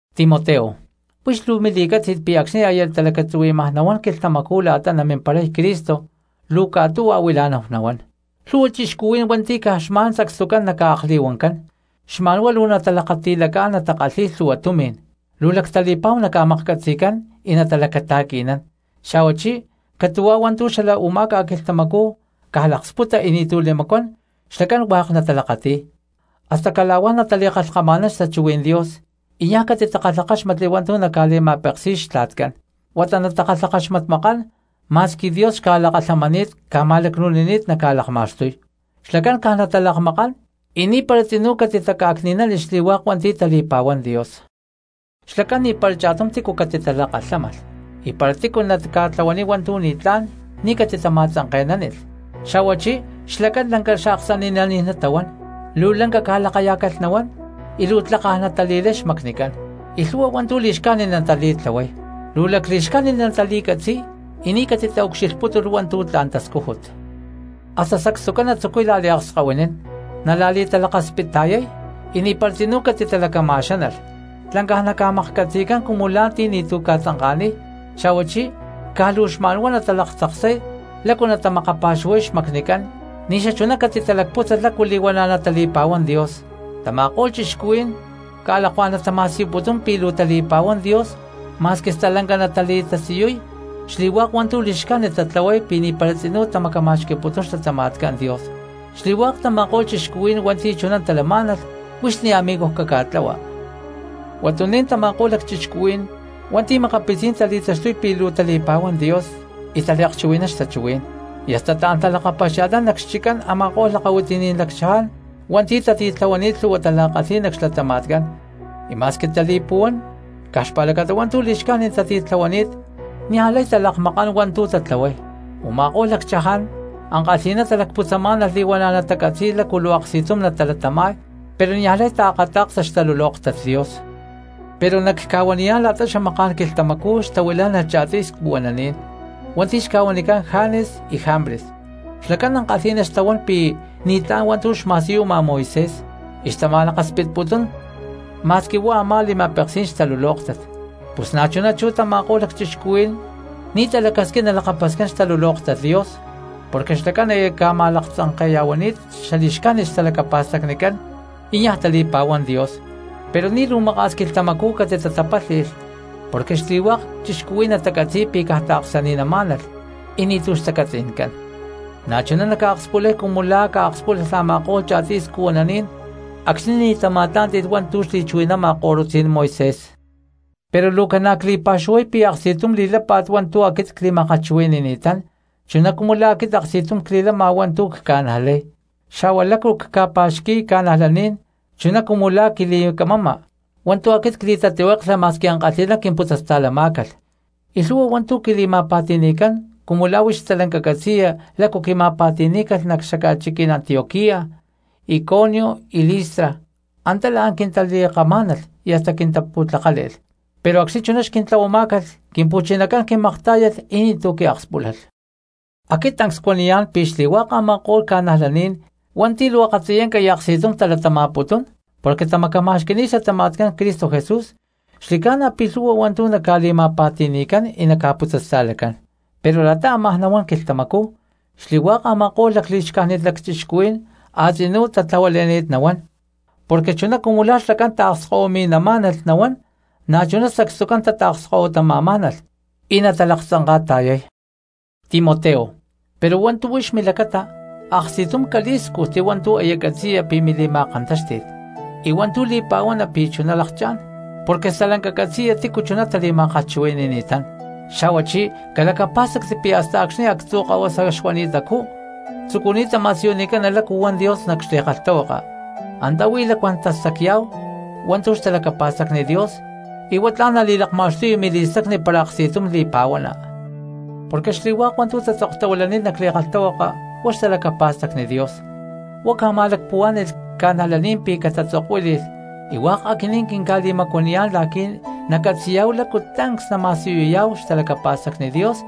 Timoteo, huix luu mili̠cátzi̠t pi̠ acxni̠ aya talacatzuhui̠maj nahuán quilhtamacú la̠ta namimparay Cristo luu catu̠huá huila̠náhu nahuán. Lhu̠hua cristianos hua̠nti̠ caj xma̠n sacstucán naca̠akli̠huancán, xma̠n huá luu natalakati̠lacá̠n natakalhi̠y lhu̠hua tumi̠n; luu lactali̠pa̠hu naca̠maklhcatzi̠cán y natalacata̠qui̠nán, xa̠huachí catu̠hua hua̠ntu̠ xala u̠má ca̠quilhtamacú caj laksputa y ni̠tu̠ li̠macuán xlacán hua̠k natalakati̠y. Hasta cala̠huá natali̠kalhkama̠nán xtachuhuí̠n Dios y niaj catitakalhakáxmatli hua̠ntu̠ naca̠li̠ma̠peksi̠y xtla̠tcán huata natakalhakaxmatmakán, ma̠squi Dios xca̠lakalhamani̠t ca̠ma̠lacnu̠nini̠t naca̠lakma̠xtuy, xlacán caj natalakmakán y ni̠para tzinú catitaca̠cni̠nánilh xli̠hua̠k hua̠nti̠ tali̠pa̠huán Dios. Xlacán ni̠para cha̠tum tícu catitalakalhámalh, y para tícu naca̠tlahuaniy hua̠ntu̠ ni̠tlá̠n ni̠ catitama̠tzanke̠nánilh, xa̠huachí xlacán lanca xaaksani̠naní̠n natahuán, luu lanca ca̠lakayá̠calh nahuán y luu tlakaj natali̠lay xmacnicán y lhu̠hua hua̠ntu̠ li̠xcájnit natali̠tlahuay, luu lacli̠xcájnit natali̠catzi̠y y ni̠ catitaucxilhputúlh hua̠ntu̠ tla̠n tascújut. Hasta sacstucán natzucuy la̠liakskahuinín nala̠li̠talakaspitta̠yay y ni̠para tzinú catitalacama̠xánalh, tlancaj naca̠maklhcatzi̠cán cumu la̠ ti̠ ni̠tu̠ ca̠tzanka̠niy, xa̠huachí caj luu xma̠nhuá natalaktzaksay lácu natamakapa̠xuhuay xmacnicán ni̠ xachuná catitalacpútzalh lácu li̠huana̠ natali̠pa̠huán Dios. Tama̠ko̠lh cristianos ca̠lakuá̠n natama̠siyuputún pi̠ luu tali̠pa̠huán Dios ma̠squi stalanca natali̠tasiyuy xli̠hua̠k hua̠ntu̠ li̠xcájnit tatlahuay pi̠ ni̠para tzinú tamacama̠xqui̠putún xlatama̠tcán Dios. Xli̠hua̠k tama̠ko̠lh cristianos hua̠nti̠ chuná talamá̠nalh huix ni̠ amigoj caca̠ta̠la. Huatuní̠n tama̠ko̠lh lacchixcuhuí̠n hua̠nti̠ makapitzí̠n tali̠taxtuy pi̠ luu tali̠pa̠huán Dios y taliakchuhui̠nán xtachuhuí̠n, y hasta taán talakapaxia̠lhnán nac xchiccán a̠ma̠ko̠lh lakahuitiní̠n lacchaján hua̠nti̠ tatitlahuani̠t lhu̠hua tala̠kalhí̠n nac xlatama̠tcán, y ma̠squi tali̠li̠puhuán caj xpa̠lacata hua̠ntu̠ li̠xcájnit tatitlahuani̠t niaj lay talakmakán hua̠ntu̠ tatlahuay. Uma̠kó̠lh lacchaján ankalhi̠ná talacputzamá̠nalh li̠huana̠ natacatzi̠y lácu luu aksti̠tum natalatama̠y, pero niaj lay taakata̠ksa xtalulóktat Dios. Pero nacca̠huaniyá̠n la̠ta xamaká̠n quilhtamacú xtahuilá̠nalh cha̠tuy scuhuananí̠n hua̠nti̠ xca̠huanicán Janes y Jambres, xlacán ankalhi̠ná xtahuán pi̠ ni̠tlá̠n hua̠ntu̠ xma̠siyuma Moisés y xtama̠laksputuputún ma̠squi huá a̠má li̠ma̠peksí̠n xtalulóktat, pus na̠chuná chú tama̠ko̠lh lacchixcuhuí̠n ni̠ talacasquín nalakapascán xtalulóktat Dios, porque xlacán aya ca̠ma̠laktzanke̠ya̠huani̠t xali̠xcájnit xtalacapa̠stacnicán y niaj tali̠pa̠huán Dios. Pero ni̠ luu maka̠s quilhtamacú catitatapálhi̠lh porque xli̠hua̠k cristianos natacatzi̠y pi̠ caj taaksani̠namá̠nalh y ni̠tu̠ xtacatzi̠ncán, na̠chuná naca̠akspulay cumu la̠ ca̠akspúlalh a̠ma̠ko̠lh cha̠tiy scuhuananí̠n acxni̠ ni̠ tama̠tlá̠nti̠lh hua̠ntu̠ xli̠chuhui̠nama ko̠lutzí̠n Moisés. Pero luu ca̠na cli̠pa̠xuhuay pi̠ aksti̠tum li̠lápa̠t hua̠ntu̠ aquit cli̠ma̠kalhchuhui̠ni̠ni̠tán chuná cumu la̠ aquit aksti̠tum cli̠lama hua̠ntu̠ luu cca̠najlay, xa̠hua lácu cca̠pa̠xqui̠y cristianos, chuná cumu la̠ quili̠camama hua̠ntu̠ aquit cli̠tatlihueklha ma̠squi ankalhi̠ná. Quimputzasta̠lamá̠calh y lhu̠hua hua̠ntu̠ quili̠ma̠pa̠ti̠ni̠cán cumu la̠ huix stalanca catzi̠ya lácu quima̠pa̠ti̠ní̠calh nac xaca̠chiquí̠n Antioquía, Iconio y Listra, antá la̠n quintali̠kamá̠nalh y hasta quintapu̠tlakále̠lh, pero acxni̠ chuná xquintlahuamá̠calh Quimpu̠chinacán quimaktá̠yalh y ni̠tu̠ quiakspúlalh. Aquit tancs cuaniyá̠n pi̠ xli̠hua̠k a̠ma̠ko̠lh cristianos hua̠nti̠ luu akatziyanca y aksti̠tum talatama̠putún porque tamacama̠xqui̠ni̠t xlatama̠tcán Cristo Jesús, xli̠ca̠na pi̠ lhu̠hua hua̠ntu̠ naca̠li̠ma̠pa̠ti̠ni̠cán y naca̠putzasta̠lacán. Pero la̠ta ámaj nahuán quilhtamacú xli̠hua̠k a̠ma̠ko̠lh lacli̠xcájnit lacchixcuhuí̠n a̠tzinuj tatla̠huale̠ni̠t nahuán porque chuná cumu la̠ xlacán taakskahuimi̠namá̠nalh nahuán na̠chuná sacstucán tataakskahuitama̠má̠nalh y natalaktzanka̠ta̠yay. Timoteo, pero hua̠ntu̠ huix milacata aksti̠tum calí̠scujti hua̠ntu̠ aya catzi̠ya pi̠ mili̠ma̠kantáxti̠t, y hua̠ntu̠ li̠pa̠huana pi̠ chuná lakchá̠n, porque stalanca catzi̠ya tícu chuná tali̠ma̠kalhchuhui̠ni̠ni̠tán. Xa̠huachí calacapá̠stacti pi̠ hasta acxni̠ actzu̠ kahuasa xuani̠tacú tzucuni̠ta ma̠siyunicana lácu huan Dios nac xli̠kalhtahuaka, antá huí lacuán tastacya̠hu hua̠ntu̠ xtalacapa̠stacni Dios y huá tla̠n nali̠lakma̠xtuya mili̠stacni para aksti̠tum li̠pa̠huana. Porque xli̠hua̠k hua̠ntu̠ tatzoktahuilani̠t nac li̠kalhtahuaka huá xtalacapa̠stacni Dios, huá ca̠ma̠lacpuhuá̠ni̠lh cristianos pi̠ catatzokuíli̠lh y hua̠k aquinín quinca̠li̠macuaniyá̠n la̠qui̠ nacatzi̠yá̠hu lácu tancs nama̠siyuyá̠hu xtalacapa̠stacni Dios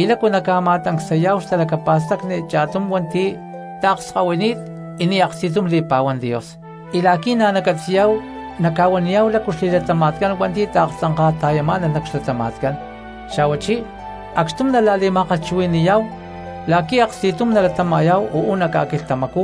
y lácu nama̠tancsayá̠hu xtalacapa̠stacni cha̠tum hua̠nti̠ taakskahuini̠t y ni̠ aksti̠tum li̠pa̠huán Dios, y la̠qui̠ na̠ nacatzi̠yá̠hu naca̠huaniyá̠hu lácu xli̠latama̠tcán hua̠nti̠ taaktzanka̠ta̠yamá̠nalh nac xlatama̠tcán, xa̠huachí acxtum nala̠li̠ma̠kalhchuhui̠ni̠yá̠hu la̠qui̠ aksti̠tum nalatama̠yá̠hu uú nac ca̠quilhtamacú,